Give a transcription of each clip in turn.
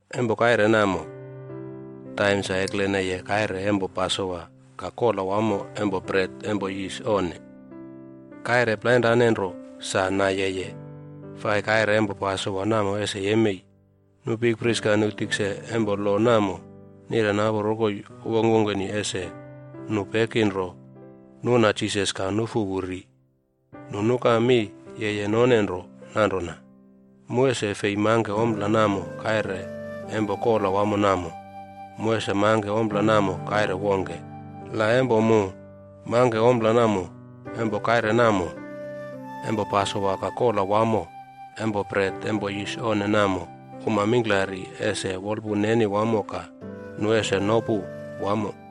Empo kaire namo, taim sa ekleneye kaire empo Pasowa ka Kola Wamo Empo Bret Empo Yis Onne. Kaire plainrane nro sa nayeye fai kaire empo Pasowa namo ese yemei. Nu bikpris ka nu tikse empo lo namo nire napu rokoi wongkwongkeni ese nu peki nro nuna Jisas ka nufu wu ri. Nu nuka mi yeye none nro nanrona, “Mu ese fei mangke ompla namo kaire empo kola wamo namo. Mu ese mangke ompla namo kaire wongke. La empo mu mangke ompla namo empo kaire namo empo Pasowa ka Kola Wamo Empo Bret Empo Yis Onne namo, uma mingklari ese wolpun neni wamo ka nu ese nopu wamo.”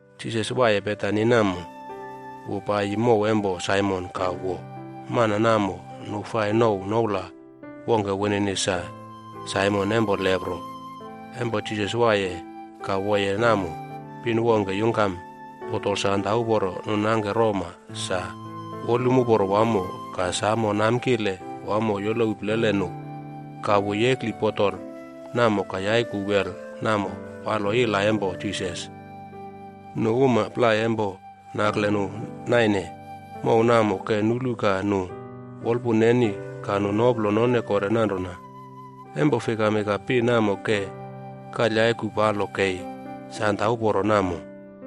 Jisas waiye Betani namo, wu paiyi mow empo Saimon ka wo. Mana namo nu fai nouw noula wongke wunini sa Saimon empo Lepro. Empo Jisas waiye ka woye namo, pin wongke yungkam botol sanda uporo nu nangke roma sa wolum uporo wamo ka samo namkile wamo yolowi plele nu. Ka wu yekli botol namo ka yaiku wel namo palo ila empo Jisas. Nu uma plai empo nakle nu naine mow namo ke nulu ka nu wolpun neni ka nu noplo none kore nanrona, “Empo fikami ka pin namo ke kalyaiku palo kei sanda uporo namo?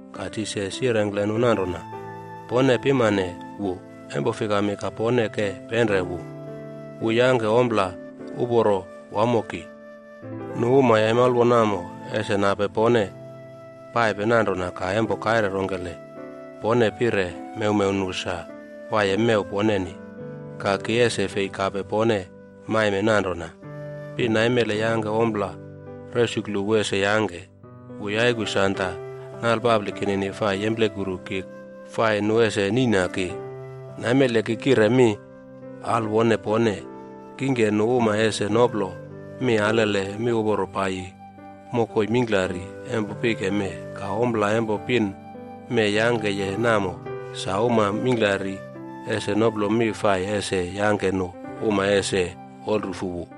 Ka Jisas yirengkle nu nanrona, “Pone pimane wu. Empo fikami ka pone ke penre wu? Wu yangke ompla uporo wamo ki. Nu uma yaimalwo namo, ese nape pone paipe nanrona ka empo kaire rongkele pone pire mewmew nu sa waiye mew poneni. Ka ki ese fei kape pone maime nanrona. Pin naimele yangke ompla resuklu wu ese yangke. Wu yaiku sanda nalpapli kinini fai yemplekuru ki fai nu ese niꞌna ki. Naimele ki kire mi alwone pone, kingke nu uma ese noplo mi alele miuporo paiyi mokoi mingklari empo pike mee. Ka ompla empo pin mee yangkeye namo, sa uma mingklari ese noplo mi fai ese yangke nu uma ese wolrufu wu.”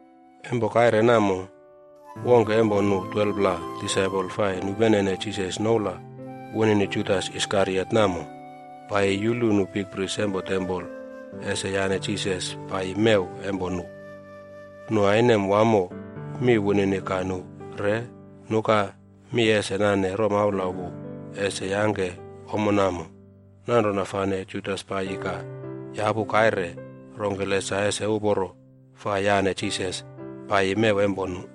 Empo kaire namo, wongke empo nu 12pla disaipol fai nupenene Jisas noula wunini Judas Iskariot namo, paiyi yulu nu bikpris empo tempol ese yane Jisas paiyi mew empo nu. Nu ainem wamo mi wunini ka nu re nukami ese nane romaula wu ese yangke ommo namo. Nanrona fane Judas paiyi ka yapu kaire rongkele sa ese uporo fai yane Jisas paiyi mew empo nu.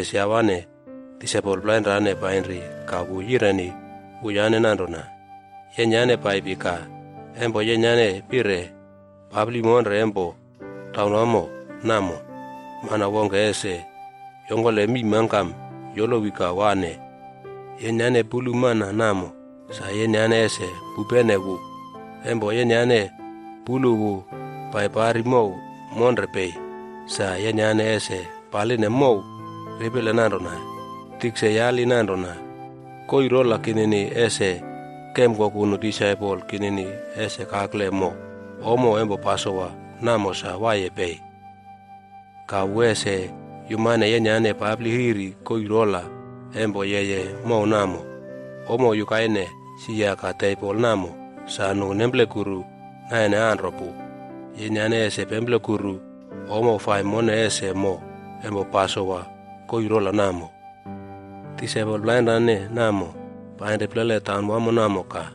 Ka Jisas yawane disaipol plainrane painri ka wu yireni wuyane nanrona, “Yenyane paipi ka empo yenyane pire papli monre empo taunwamo namo, mana wongke ese yongkole mii mangkam yolowi ka wane yenyane. Empo yenyane pulu mana namo, sa yenyane ese pupene wu. Empo yenyane pulu wu pai pari mow monre pei, sa yenyane ese paline mow ripile nanrona, ‘Tikse yali nanrona, “Koii rola kinini ese kemkoku nu disaipol kinini ese kakle mo ommo empo Pasowa namo sa waiye pei?” ’ Ka wu ese yumane yenyane papli riri koii rola empo yeye mow namo. Ommo yukaine sia ka tebol namo sa nu nemplekuru naine anro pu. Yenyane ese pemplekuru ommo fai mone ese mo empo Pasowa koii rola namo.” Disaipol plainrane namo painri plele taunwamo namo ka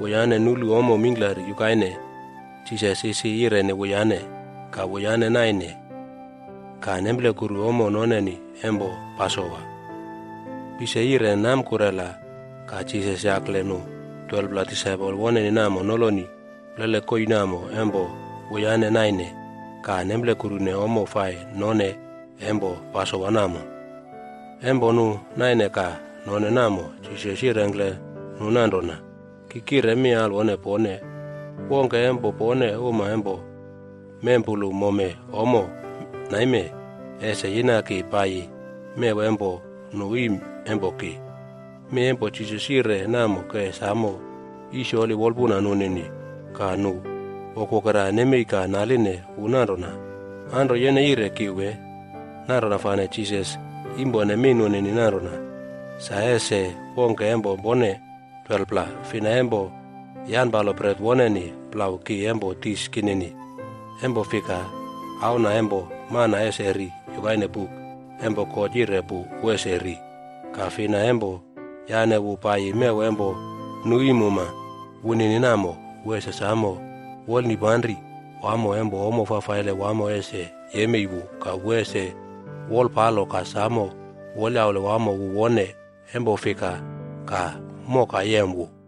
wuyane nulu ommo mingklari yukaine Jisas isi yireni wuyane. Ka wuyane naine ka nemplekuru ommo noneni empo Pasowa. Pise yire namkurela ka Jisas yakle nu 12pla disaipol woneni namo noloni plele koii namo empo wuyane naine ka nemplekurune ommo fai none empo Pasowa namo. Empo nu naine ka none namo, Jisas yirengkle nu nanrona, “Ki kire mi alwone pone, wongke empo pone uma empo mempulu mome ommo naime, ese yina ki paiyi mew empo nu iim empo ki.” Mi empo Jisas yire namo ke samo yisyoli wolpuna nunini ka nu wokwokera nemei ka naline wu nanrona, “Anro yene yire ki wee?” Nanrona fane Jisas yimpone mi nunini nanrona, “Sa ese wongke empo pone 12pla. Fina empo yanpalo bret woneni plau ki empo dis kinini. Empo fika Auna Empo Mana ese ri yukaine buk empo God yire pu wu ese ri. Ka fina empo yane wu paiyi mew empo nu iim wunini namo, wu ese samo wolnipanri wamo empo ommo fafaile wamo ese yemei wu ka wu ese wolpalo ka samo wolyaule wamo wu wone. Empo fika ka moka yem wu?”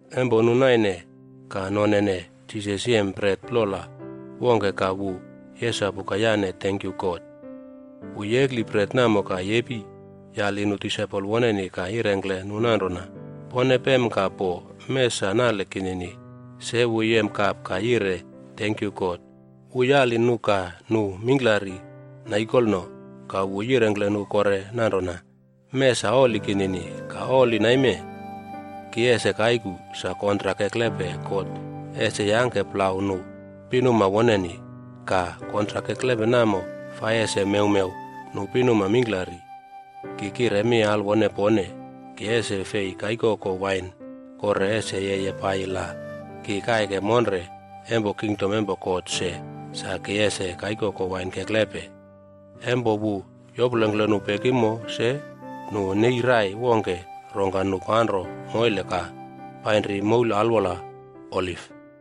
Empo nu naine ka nonene Jisas yem bret plola wongke ka wu yesapu ka yane tenkyu God. Wu yekli bret namo ka yepi yali nu disaipol woneni ka yirengkle nu nanrona, “Pone pem ka po. Mee sa nale kinini.” Se wu yem kap ka yire tenkyu God. Wu yali nu ka nu mingklari naikolno. Ka wu yirengkle nu kore nanrona, “Mee sa oli kinini. Ka oli naime ki ese kaiku, sa kontrak keklepe God ese yangke plau nu pinuma woneni. Ka kontrak keklepe namo fai ese mewmew nu pinuma mingklari. Ki kire mi alwone pone, ki ese fei kaikoko wain kore ese yeye paiyi la ki kaike monre empo kingdom empo God se sa ki ese kaikoko wain keklepe.” Empo wu yoplongkle nu pekimo se, nu nei rai wongke rongka nu panro moile ka painri moul alwola Oliv.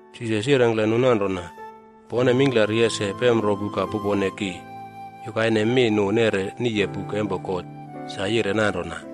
Jisas yirengkle nu nanrona, “Pone mingklari ese pemropu ka pupone ki yukaine mi nu neꞌre niye buk empo God sa yire nanrona,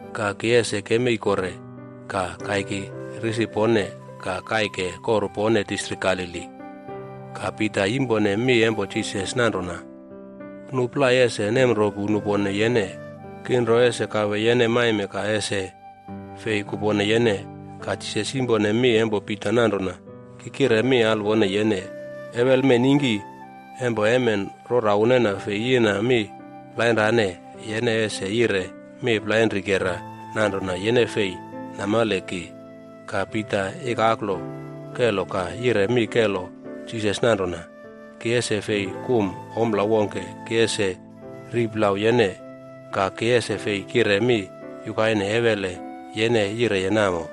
Ka ki ese kemei kore ka kaiki risi pone ka kaike koru pone distrik Galili.” Ka Pita yimpone mi empo Jisas nanrona, “Nu plai ese nemropu nupone yene. Ki nro ese kawe yene maime ka ese fei kupone yene.” Ka Jisas yimpone mi empo Pita nanrona, “Ki kire mi alwone yene, ewele mee ningki, empo emen rora unena fei yina mi plainrane, yene ese yire mi plainrikera nanrona yene fei namale ki.” Ka Pita ikaklo kelo ka yire mi kelo Jisas nanrona, “Ki ese fei kum ompla wongke ki ese ri plau yene. Ka ki ese fei kire mi yukaine ewele yene yireye namo.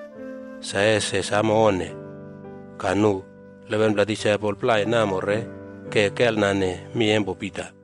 Sa ese samo onne!” Ka nu 11pla disaipol plai namo re ke kelnane mi empo Pita.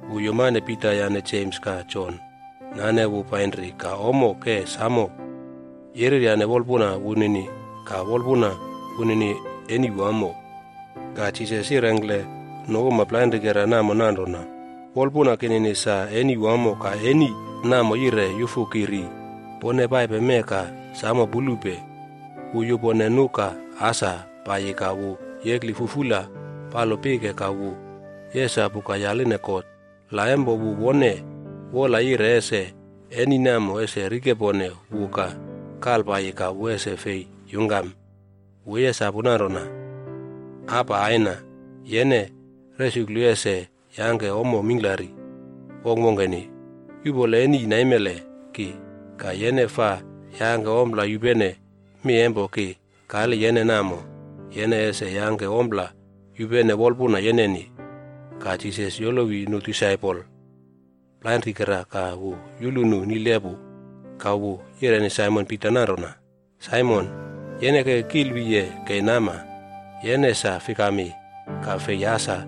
Wu yumane Pita yane Jems ka Jon nane wu painri ka ommo ke samo yereryane wolpuna wunini ka wolpuna wunini eni wamo. Ka Jisas yirengkle nu uma plainrikera namo nanrona, “Wolpuna kinini sa eni wamo ka eni namo yire yufu ki ri. Pone paipe mee ka samo pulupe.” Wu yupone nu ka asa paiyi ka wu yekli fufula palo pike ka wu yesapu ka yaline God la empo wu wone wola yire ese eni namo ese rikepone wu ka kalpaiyi ka wu ese fei yungkam. Wu yesapu nanrona, “Aba Aina, yene resuklu ese yangke ommo mingklari wongkwongkeni. Yuꞌpole eni naimele ki. Ka, yene faa yangke ompla yupene mi empo ki kali yene namo, yene ese yangke ompla yupene wolpuna yeneni.” Ka Jisas yolowi nu disaipol plainrikera ka wu yulu nu nile pu. Ka wu yireni Saimon Pita nanrona, “Saimon, yene ke kilwiye kei nama! Yene sa fikami ka fei asa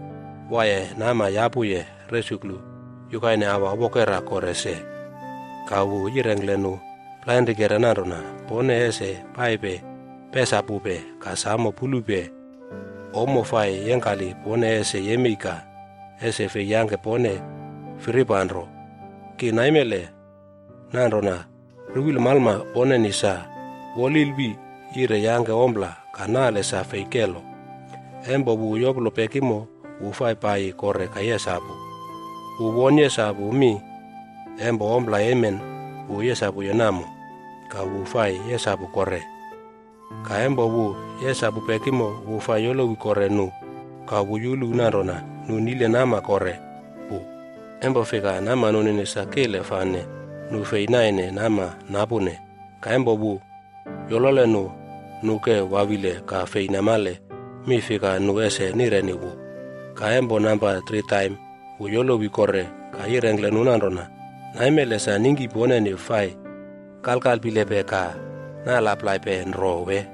waiye nama yapuye resuklu yukaine aua wokera kore se?” Ka wu yirengkle nu plainrikera nanrona, “Pone ese paipe pesapupe ka samo pulupe ommo fai yengkali pone ese yemei ka ese fei yangke pone firipanro. Ki namale nanrona ruwil malma poneni sa wolilwi yire yangke ompla, ka nale sa fei kelo.” Empo wu yoplo pekimo wu fai paiyi kore ka yesapu. Wu won yesapu mi empo ompla emen wu yesapuye namo, ka wu fai yesapu kore. Ka empo wu yesapu pekimo wu fai yolowi kore nu ka wu yulu nanrona nu nile nama kore pu. Empo fika nama nunini sa kile fane nu fei naine nama napune. Ka empo wu yolole nu, nu ke wawile ka fei namale mi fika nu ese nireni wu. Ka empo namba tri taim wu yolowi kore ka yirengkle nu nanrona, “Naimele sa ningki poneni fai kalkalpilepe ka nalaplaipe nro wee?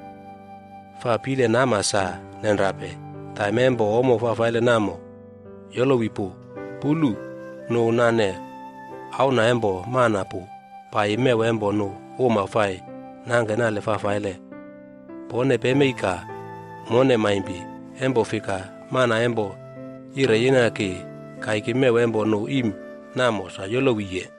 Faa pile nama sa nenrape! Taim empo ommo fafaile namo yolowi pu. Pulu, nu nane Auna Empo Mana pu paiyi mew empo nu uma fai nangke nale fafaile. Pone pemei ka mone maimpi. Empo fika mana empo yire yina ki kaiki mew empo nu iim namo, sa yolowiye.”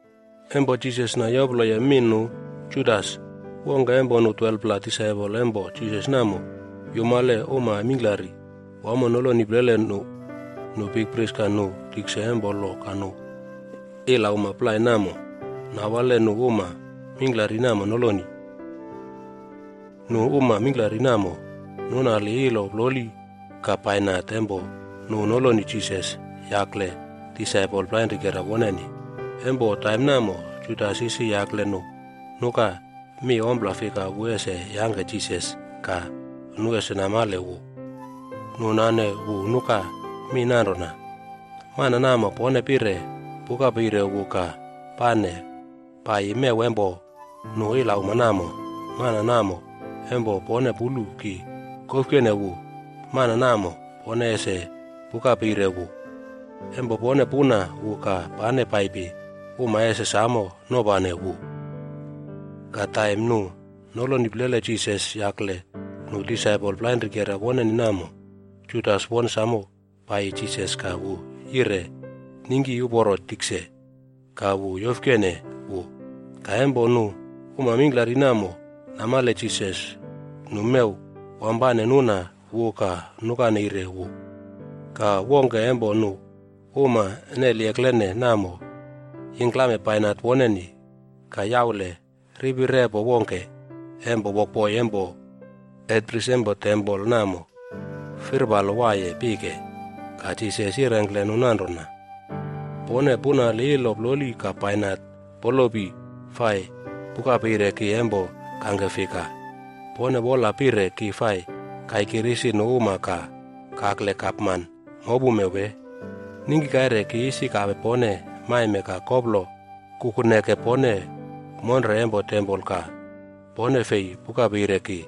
Empo Jisas nayoploye mi nu, Judas, wongke empo nu 12pla disaipol empo Jisas namo yumale uma mingklari wamo noloni plele nu. Nu bikpris ka nu tikse empo lo ka nu ilauma plai namo nawale nu uma mingklari namo noloni. Nu uma mingklari namo nunali ilo ploli ka bainat empo nu noloni Jisas yakle disaipol plainrikera woneni. Empo taim namo, Judas isi yakle nu nuka mi ompla fika wu ese yangke Jisas ka nu ese namale wu. Nu nane wu nuka mi nanrona, “Mana namo pone pire pukapeire wu ka pane paiyi mew empo nu ilauma namo, mana namo empo pone pulu ki kofkene wu, mana namo pone ese pukapeire wu. Empo pone puna wu ka pane paipi, uma ese samo nopane wu.” Ka taim nu noloni plele Jisas yakle nu disaipol plainrikera woneni namo, Judas won samo paiyi Jisas ka wu yire “Ningki uporo tikse!” ka wu yofkene wu. Ka empo nu uma mingklari namo namale Jisas, nu mew wampane nuna wu ka nuka neire wu. Ka wongke empo nu uma neli eklene namo yingklame bainat woneni ka yaule ripi repo wongke empo wokboi empo hetpris empo tempol namo firpalo waiye pike. Ka Jisas yirengkle nu nanrona, “Pone punali ilo ploli ka bainat polopi fai pukapeire ki empo kangke fika? Pone wola pire ki fai kaiki risi nu uma ka kakle gapman mopume wee? Ningki kaire ki isi kape pone maime ka koplo kukuneke pone monre empo tempol ka pone fei pukapeire ki.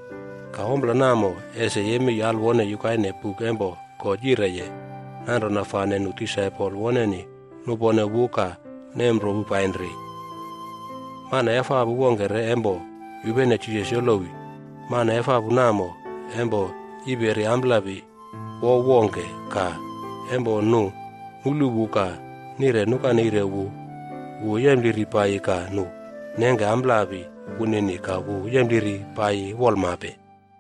Ka ompla namo ese yemei alwone yukaine buk empo God yireye.” Nanrona fane nu disaipol woneni nupone wu ka nemropu painri. Mana efapu wongke re empo yupene Jisas yolowi. Mana efapu namo empo yiperi amplapi wouw wongke. Ka empo nu nulu wu ka nire nukaneire wu, wu yempliri paiyi ka nu nengke amplapi wunini ka wu yempliri paiyi wolmape.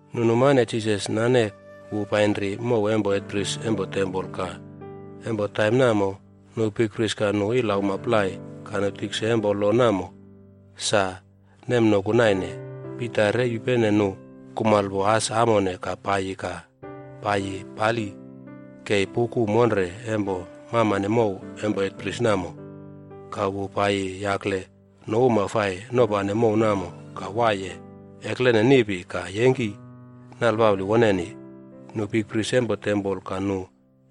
Nu numane Jisas nane wu painri mow empo hetpris empo tempol. Ka empo taim namo, nu bikpris ka nu ilauma plai ka nu tikse empo lo namo, sa nemnoku naine. Pita re yupene nu kumalpo as amone ka paiyi ka paiyi pali kei puꞌku monre empo mamane mow empo hetpris namo. Ka wu paiyi yakle nu uma fai nopane mow namo ka waiye eklene niꞌpi ka yengki nalpapli woneni. Nu bikpris empo tempol ka nu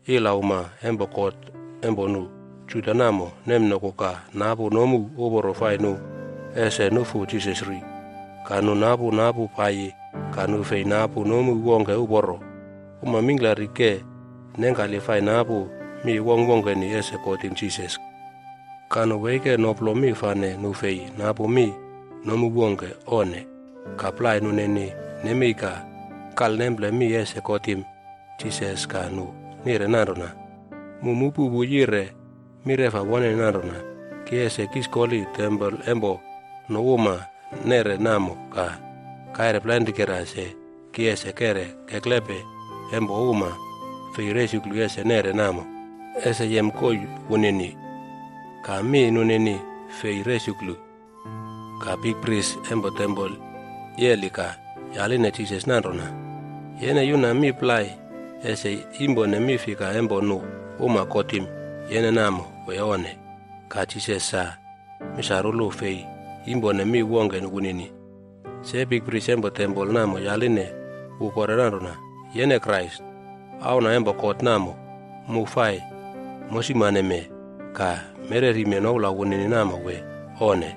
ilauma empo kot empo nu Juda namo nemnoku ka napu nomu uporo fai nu ese nufu Jisas ri. Ka nu napu napu paiyi ka nu fei napu nomu wongke uporo. Uma mingklari ke nengkali fai napu mi wongkwongkeni ese kotim Jisas. Ka nu weike noplo mi fane nu fei napu mi nomu wongke. Onne. Ka plai nunini nemei ka kalnemple mi ese kotim Jisas ka nu nire nanrona, “Mu mupu wu yire mireꞌfa woneni nanrona, ‘Ki ese kiskoli tempol empo nu uma nere namo ka kaire plainrikera se ki ese keꞌre keklepe empo uma fei resuklu ese neꞌre namo, ese yem koii wunini.’” Ka mi nunini fei resuklu. Ka bikpris empo tempol yeli ka yaline Jisas nanrona, “Yene yuna mi plai ese yimpone mi fika empo nu uma kotim yene namo, wee onne?” Ka Jisas sa misarulu fei yimpone mi wongke wunini. Se bikpris empo tempol namo yaline wu kore nanrona, “Yene Krais, Auna empo God namo mu fai mosimaneme ka mererime noula wunini namo wee onne?”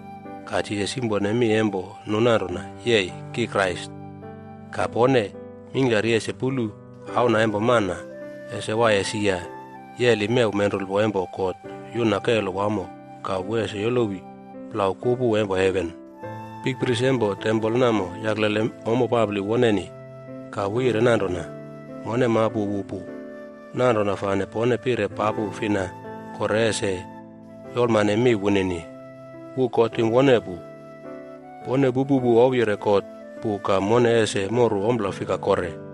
Ka Jisas yimpone mi empo nu nanrona, “Yei, ki Krais. Ka pone mingklari ese pulu Auna empo Mana ese waiye sia yeli mew menrulpo empo God yuna kelo wamo ka wu ese yolowi plau kupu empo heven.” Bikpris empo tempol namo yaklele ommo papli woneni ka wu yire nanrona, “Mone mapu wu pu. Nanrona fane pone pire papu fina kore ese yolmane mi wunini? Wu kotim wone pu. Pone pupu wu ouwyire God pu ka mone ese moru ompla fika kore?”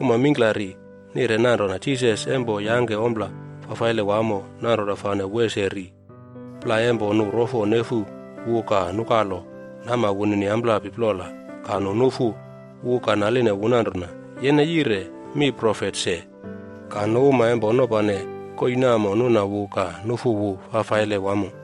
Uma mingklari nire nanrona Jisas empo yangke ompla fafaile wamo nanrona fane wu ese ri. Plai empo nu rofo nefu wu ka nukalo nama wunini amplapi plola ka nu nufu wu ka naline wu nanrona, “Yene yire mi profet se!” Ka nu uma empo nopane koii namo nuna wu ka nufu wu fafaile wamo.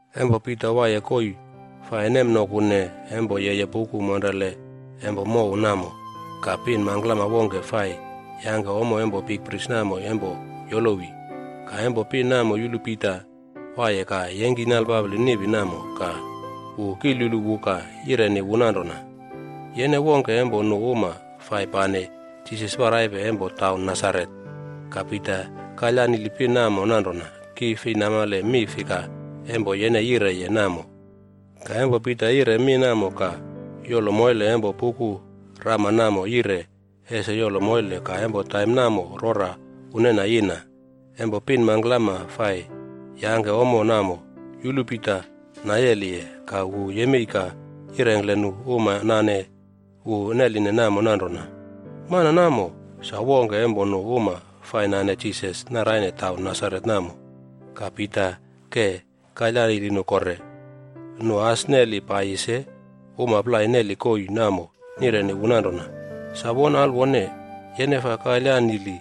Empo Pita waiye koii fai nemnokune empo yeye puku monrele empo mow namo, ka pin mangklama wongke fai yangke ommo empo bikpris namo empo yolowi. Ka empo pin namo yulu Pita waiye ka yengki nalpapli niꞌpi namo ka wu kilyulu wu ka yireni wu nanrona, “Yene wongke empo nu uma fai pane Jisas paraipe empo taun Nasaret.” Ka Pita kalyanili pin namo nanrona, “Ki fei namale mi fika empo yene yireye namo.” Ka empo Pita yire mi namo ka yolo moile empo puku rama namo yire ese yolo moile ka empo taim namo rora unena yina. Empo pin mangklama fai yangke ommo namo yulu Pita nayeliye ka wu yemei ka yirengkle nu uma nane wu neline namo nanrona, “Mana namo sa wongke empo nu uma fai nane Jisas naraine taun Nasaret namo.” Ka Pita ke kalyanili nu kore. Nu as neli paiyi se uma plai neli koii namo nireni wu nanrona, “Sa won alwone, yene faa kalyanili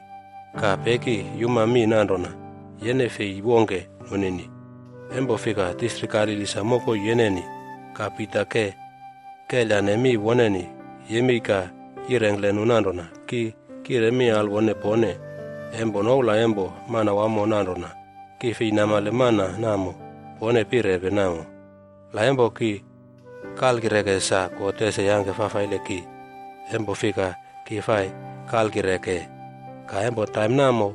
ka peki yuma mi nanrona yene fei wongke nunini. Empo fika distrik Galili sa mokoi yeneni.” Ka Pita ke kelyane mi woneni yemei ka yirengkle nu nanrona, “Ki kire mi alwone pone empo noula empo Manawamo nanrona ki fei namale mana namo pone pirepe namo. La empo ki kalkireke sa, God ese yangke fafaile ki empo fika ki fai kalkireke.” Ka empo taim namo,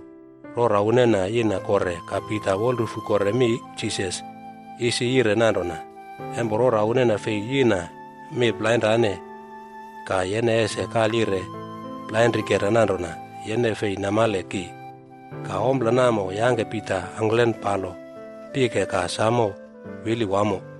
rora unena yina kore ka Pita wolrufu kore mi Jisas isi yire nanrona, “Empo rora unena fei yina mi plainrane ka yene ese kalyire plainrikera nanrona yene fei namale ki.” Ka ompla namo yangke Pita angklen palo pike ka samo wili wamo.